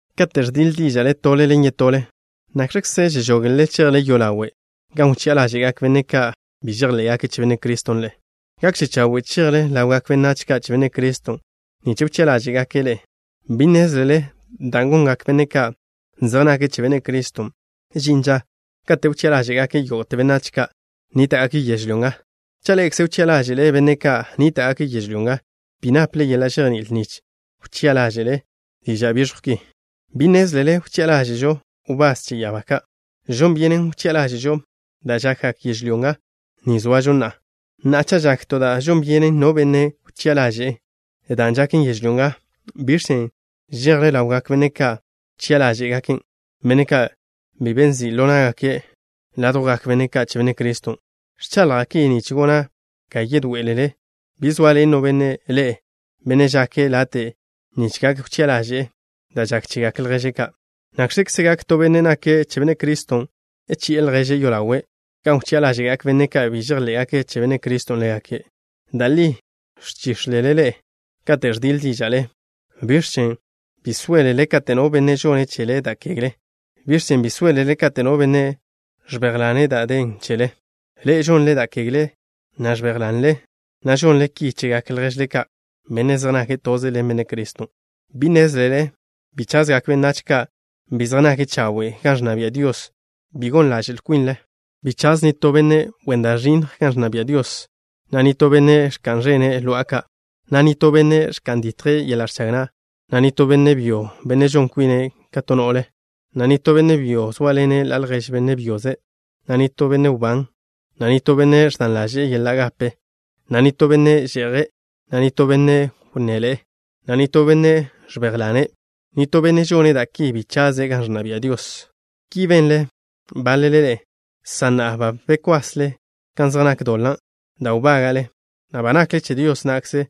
Kate' ẕdiḻe díža'le tole ḻen yetole, ¿nakx̱kze žežogle chejle yolawe' gan wchi'a ḻáže'gak benne' ka' bi žejḻé'gake' che Benne' Criston' ḻe'e? Gakže chawe' chejle ḻawgak benách ka' che Benne' Criston' nich wchi'a ḻáže'gake' ḻe'e. ¿Bi nnézlele da' gongak benne' ka' zej nake' che Benne' Criston'? Žin ža kate' wchi'a ḻáže'gake' yógo'te benách ka' nníta'gake' yežlyó nga. Cha' ḻe'ekze wchi'a ḻáže'le benne' ka' nníta'gake' yežlyó nga, ¿bi naple yeḻa' žejní'il nich wchi'a ḻáže'le diža' biẕjw ki? ¿Bi nnézlele wchi'a ḻáže'žo wbás che ya'abá ka'? Žon byenžen wchi'a ḻáže'žo da' žakgak yežlyó ga ni zoažo na'a. Na'a, cha' žak to da' žon byenen no benne' wchi'a ḻaže'en, dan' žaken yežlyó nga, ¿biẕ chen' žejle ḻawgak benne' ka' wchi'a ḻáže'gaken', benne' ka' bi be nzi' ḻo ná'gake' ládjwgak benne' ka' che Benne' Criston'? Ẕchaḻja' ki nich gona' ga yedoé'elele. ¿Bi zoaḻen no benne' ḻe'e, benne' žake' late' nich gak wchi'a ḻaže'e da' žak chegak lježle ka'? ¿Nakx̱kze gak to benne' nake' che Benne' Criston' chi'e lježe' yolawe' gan wchi'a ḻáže'gak benne' ka' bi žejḻé'gake' che Benne' Criston' ḻégake'? Da' li ẕchíx̱lele ḻe'e kate' ẕdiḻe díža'le. ¿Biẕ chen' bi sóelele kate' no benne' žone' chele da' kegle? ¿Biẕ chen' bi sóelele kate' no benne' ẕbéjlane' da' den chele? Ḻe'e žonle da' kegle, na' ẕbéjlanle, na' žonle ki chegak lježle ka', benne' zej nake' toze ḻen Benne' Criston'. ¿Bi nnézlele bi chazgak benách ka' bi zej nake' chawe' gan ẕnna bia' Dios? Bi gon ḻaže'l kwinle. Bi chaz nitó benne' wen da' ẕinnj gan ẕnna bia' Dios, na' nitó benne' ẕka'n ẕene' lo'a ka', na' nitó benne' ẕka'n ditje' yeḻa' ẕchag na', na' nitó benne' byo, benne' žon kwine' ka to no'le, na' nitó benne' byo zóaḻene' ḻa' ljež benne' byoze', na' nitó benne' wbán, na' nitó benne' ẕdan ḻaže'e yeḻa' gape, na' nitó benne' že'je', na' nitó benne' wnné ḻe'e, na' nitó benne' ẕbéjlane'. Nitó benne' žone' da' ki bi chaze' gan ẕnna bia' Dios. Ki benle báḻele ḻe'e, san na'a ba bekwasle kan zej nak doḻa' da' wbága'le, na' ba nakle che Dios na'kze,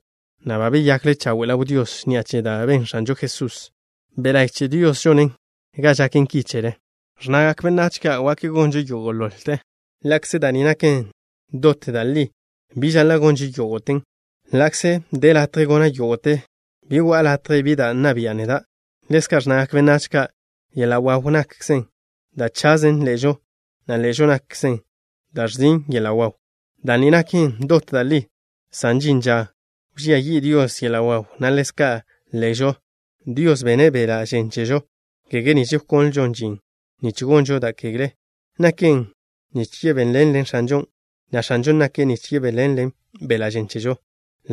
na' ba beyakle chawe' ḻaw Dios ni'a che da' ben X̱anžo Jesusen'. Be' la'y che Dios žone' ga žaken ki chele. Ẕnnagak benách ka': “Yo'o ḻo na'žo gonžo yógo'te.” Ḻa'kze da' ni naken dot da' li, bi žaḻa' gonžo yógo'ten. Ḻa'kze de latje gona' yógo'te, bi go'a latje bi da' nna bian' neda'. Ḻezka' ẕnnagak benách ka': “Yeḻa' waw nakzen da' chazen ḻe'žo, na' ḻe'žo nakzen da' ẕzin' yeḻa' waw.” Da' ni naken dot da' li, san žin ža wžía yi' Dios yeḻa' waw, na' ḻezka' ḻe'žo. Dios bene' beḻa' žen chežo, kege nich wkonlžon žin nich gonžo da' kegle. Naken nich yebéḻenlen X̱anžon', na' X̱anžon' nake' nich yebéḻenle beḻa' žen chežo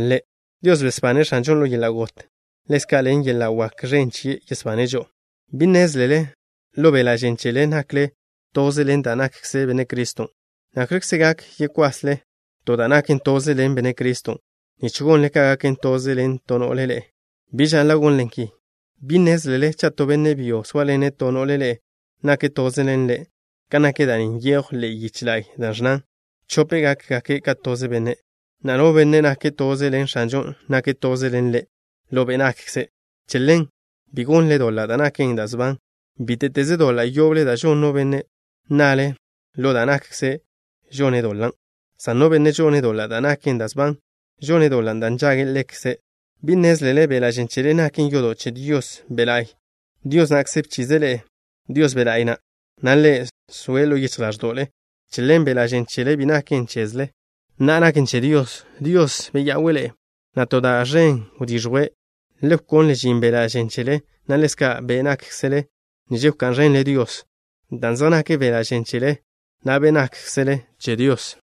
Ḻe'. Dios besbane' X̱anžon' ḻo yeḻa' got. Ḻezka', ḻen yeḻa' wak ẕen chie' yesbane' žo'o. ¿Bi nnézlele, ḻo beḻa' žen chele nakle toze ḻen da' nakkze Benne' Criston'? ¿Nakx̱kze gak yekwasle to da' naken toze ḻen Benne' Criston' nich gonle ga gaken toze ḻen to no'le ḻe'e? Bi žaḻa' gonle ki. ¿Bi nnézlele cha' to benne' byo zóaḻene' to no'le ḻe'e, nake' toze ḻen ḻe'? Kan nak da' ni nyejw ḻe'e yiche la'y, da' ẕnnan: “Chope' gákgake' ka toze benne'.” Na'a, no benne' nake' toze ḻen X̱anžon', nake' toze ḻen Ḻe' ḻo be' nakkze'. Che ḻen, bi gonle doḻa' da' naken da' sban. Bíte'teze doḻa' yoble da' žon no benne', na'le ḻo da' nakkze' žone' doḻan'. San no benne' žone' doḻa' da' naken da' sban, žone' doḻa' da' nžagen ḻekze'. ¿Bi nnézlele beḻa' žen chele naken yodo' che Dios Be' La'y? Dios na'kze bchize' ḻe'e Dios Be' La'y na', na' Ḻe' zoe' ḻo yichj ḻáẕdo'le. Che ḻen beḻa' žen chele bi naken chezle. Na'a, naken che Dios. Dios beya'we' ḻe'e, na' to da' ẕen wdiẕjwe'. Le wkonle žin beḻa' žen chele, na' ḻezka' be' nákkzele nich wká'n ẕenle Dios, dan' zej nak beḻa' žen chele, na' be' nákkzele che Dios.